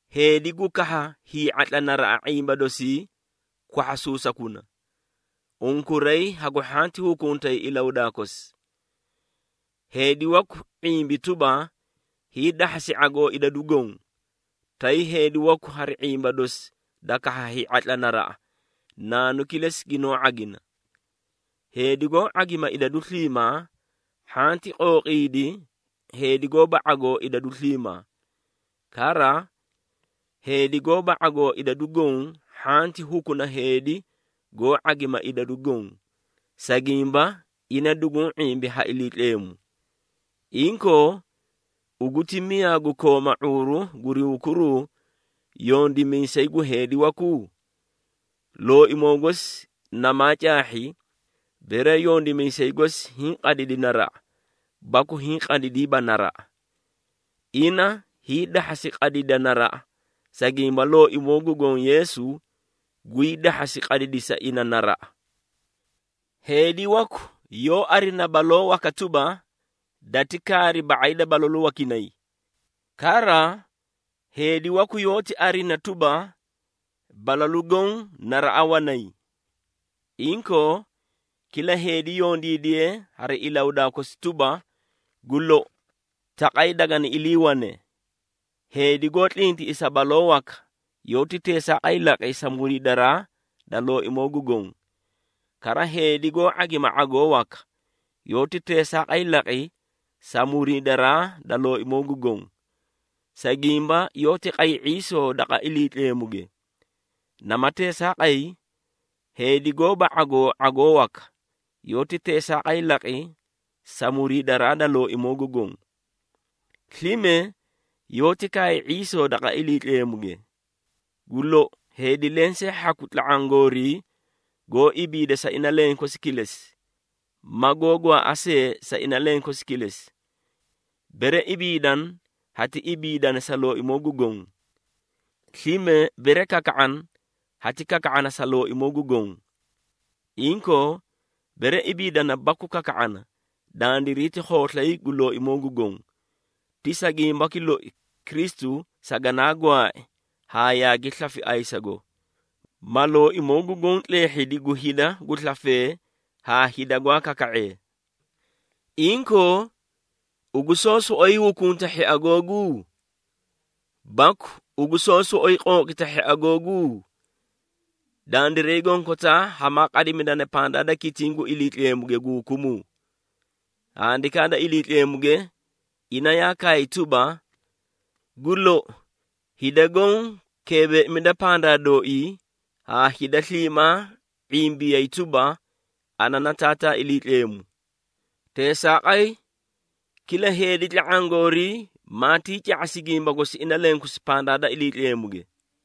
Heedi gu kahha hii⁄atla naraꞌa ⁄imba dosii, kwahhasuusakuna. Unkuray hagu hhanti hukuntay ilahudaa kosi. Heedi waku ⁄imbi tuba, hiidahhasi ⁄agoo idadu goõ, tay heedi waku hari ⁄imba dosi da kahha hii⁄atla naraꞌa, naanu kilesi ginoó ⁄agina. Heedi goó ⁄agima idadu sliimaa hhanti qooqiidi heedi gooba ⁄agoo idadu sliimaa. Kara, heedi gooba ⁄agoo idadu goõ hhanti hukuna heedi goó ⁄agima idadu goõ, sa gimba ina duguũ ⁄imbi ha Iliitleemu. Inkoo, ugu ti miyaa gu kooma ⁄uuru guri hukuruu yondimiisay gu heedi waku? Looimoo gosi namaa caahhi, bere yondimiisay gosi hiĩ qadidi naraꞌa baku hiĩ qadidiiba naraꞌa. Ina hiidahhasi qadidi naraꞌa, sa gimba Looimoo gu Goõ Yeesu gwii dahhasi qadidisa ina naraꞌa. Heedi waku yoó arina baloo waka tuba, dati kaari ba⁄ay da balalu wakinay. Kara, heedi waku yoóti arina tuba, balalu goõ naraꞌa wanay. Inkoo, kila heedi yondiidiye hari ilahudaa kosi tuba, gu lou taqay dagani iliiwane. Heedi goó tlintiꞌisa baloo waka, yoóti teesaaqay laqi sa muriidaraa da Looimoo gu Goõ. Kara, heedi goó ⁄agima ⁄agoo waka, yoóti teesaaqay laqi sa muriidaraa da Looimoo gu Goõ, sa gimba yoóti qay ⁄iisoo daqa Iliitleemuge. Nama teesaaqay, heedi goóba ⁄agoo ⁄agoo waka, yoóti teesaaqay laqi sa muriidaraa da Looimoo gu Goõ. Slime yoóti kaay ⁄iisoo daqa Iliitleemuge. Gu lou heedi lensee hhaku tla⁄aã goorii goó ibiida sa ina lenkosi kilesi, ma goó gwaaꞌa see sa ina lenkosi kilesi. Bere ibiidana, hati ibiidana sa Looimoo gu Goõ. Slime bere kaka⁄ana, hati kaka⁄ana sa Looimoo gu Goõ. Inkoo, bere ibiidana baku kaka⁄ana, dandiray ti khooslay gu Looimoo gu Goõ. Ti sa gimbaki loi, Kristu saganaa gwaai haa yaagi slafi ayisago, ma Looimoo gu Goõ tleehhidi gu hida gu slafee haa hida gwaa kaka⁄ee. Inkoo, ugu soó soꞌoyi hukunta hhia googu? Baku ugu soó soꞌoyi qooqita hhia googu? Dandiray gonkotaa hamaa qadimidana pandaa da kitiĩ gu Iliitleemuge gu hukumuu. Handikaa da Iliitleemuge, ina yaa kaay tuba, “Gu lou, hida goõ keebeeimida pandaa dooii, haa hida sliimaa ⁄imbiyay tuba, ana na Taataa Iliitleemu.” Teesaaqay, kila heedi tla⁄aã goorii maatii ca⁄asi gimba gosi ina lenkosi pandaa da Iliitleemuge.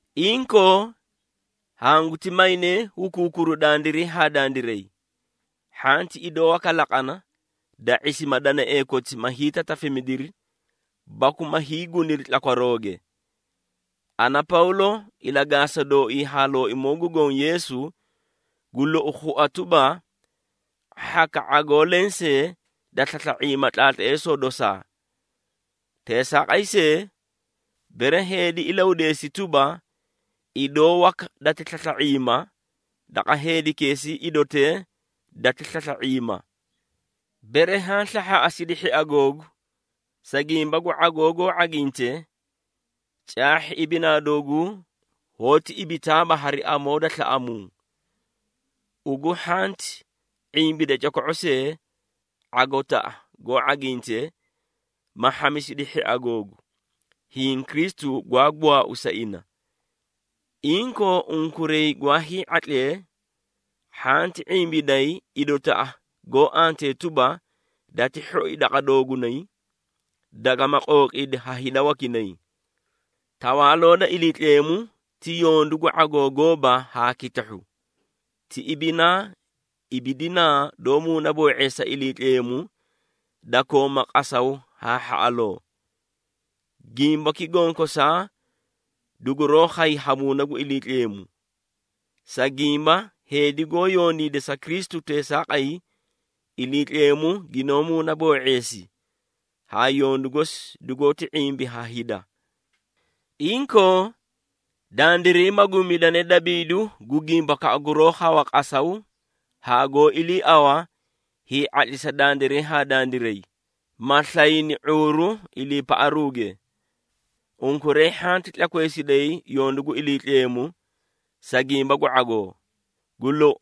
Inkoo, hanguti maynee hukuukuru dandiray haa dandiray. Hhanti idoo waka laqana, da ⁄isima danaee koti ma hiitatafimidiri baku ma hiiguniri tlakwarooge. Ana, Pawlo, ilagaasa dooii haa Looimoo gu Goõ Yeesu, gu lou khua tuba, hhaka ⁄agoo lensee da slasla⁄iima tlaatleesoo dosaa. Teesaaqay see, bere heedi ilahudeesi tuba, idoo waka dati slasla⁄iima, daqa heedikeesii idotee dati slasla⁄iima. Bere haã slahhaaꞌasidi hhia googu, sa gimba gu ⁄agoo goó ⁄aginte, caahhi ibinaa dooguu hoóti ibitaaba hari amoo da slaꞌamuu. Ugu hhanti ⁄imbida coko⁄o see, ⁄agotaꞌa goó ⁄aginte, ma hhamisidi hhia googu, hiĩ Kristu gwaa gwaau sa ina. Inkoo, unkuray gwaa hii⁄atlee hhanti ⁄imbiday idotaꞌa goó antee tuba, dati hhoi daqa doogunay, dagama qooqiidi ha hida wakinay. Tawaaloo da Iliitleemu ti yondu gu ⁄agoo gooba haa kitahhu, ti ibinaa ibidinaa doó muunaboo⁄eesa Iliitleemu, da kooma qasaw haa hhaꞌaloo. Gimbaki gonkosaa duguroó khay ha Muuna gu Iliitleemu. Sa gimba heedi goó yondiida sa Kristu teesaaqay, Iliitleemu ginoó muunaboo⁄eesi haa yondu gosi dugoóti ⁄imbi ha hida. Inkoo, dandiray maguumidanee dabiidu gu gimbakaꞌa guroó khawa qasaw haa goó iliiaꞌawa hii⁄atlisa dandiray haa dandiray, ma slayni ⁄uuru iliipaꞌaruuge. Unkuray hhanti tlakweesiday yondu gu Iliitleemu, sa gimba gu ⁄agoo. Gu lou,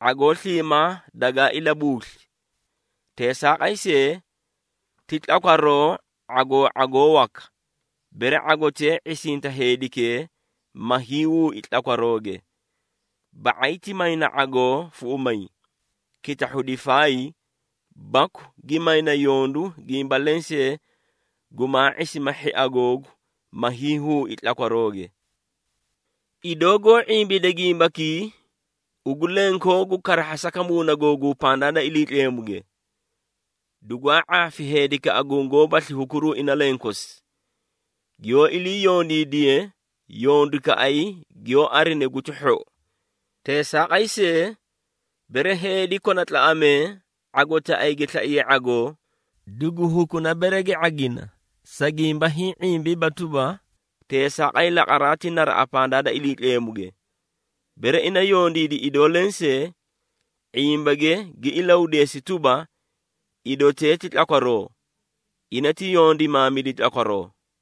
⁄agoo sliimaa dagaa ilabuusli. Teesaaqay see, ti tlakwaroo ⁄agoo ⁄agoo waka, bere ⁄agotee ⁄isinta heedikee, ma hiihuui tlakwarooge. Ba⁄ay ti mayna ⁄agoo fuꞌumay, kitahhu difaay, baku gi mayna yondu gimba lensee gumaa ⁄isima hhia googu, ma hiihuui tlakwarooge. Idoo goó ⁄imbide gimbakii, ugu lenkoogu karahhasaka muuna googuu pandaa da Iliitleemuge. Dugwaa ⁄aafi heedikaꞌa gungoóbasli hukuruu ina lenkosi, giyoó ilii yondiidiye yondukaꞌay giyoó arine guti hhou. Teesaaqay see, bere heedi kona tlaꞌamee ⁄agotaꞌay gi slaiye ⁄agoo, dugu hukuna bere gi ⁄agina, sa gimba hiĩ ⁄imbiiba tuba, teesaaqay laqaraa ti naraꞌa pandaa da Iliitleemuge. Bere ina yondiidi idoo lensee, ⁄imbage gi ilahudeesi tuba, idotee ti tlakwaroo, ina ti yondimaamidi tlakwaroo.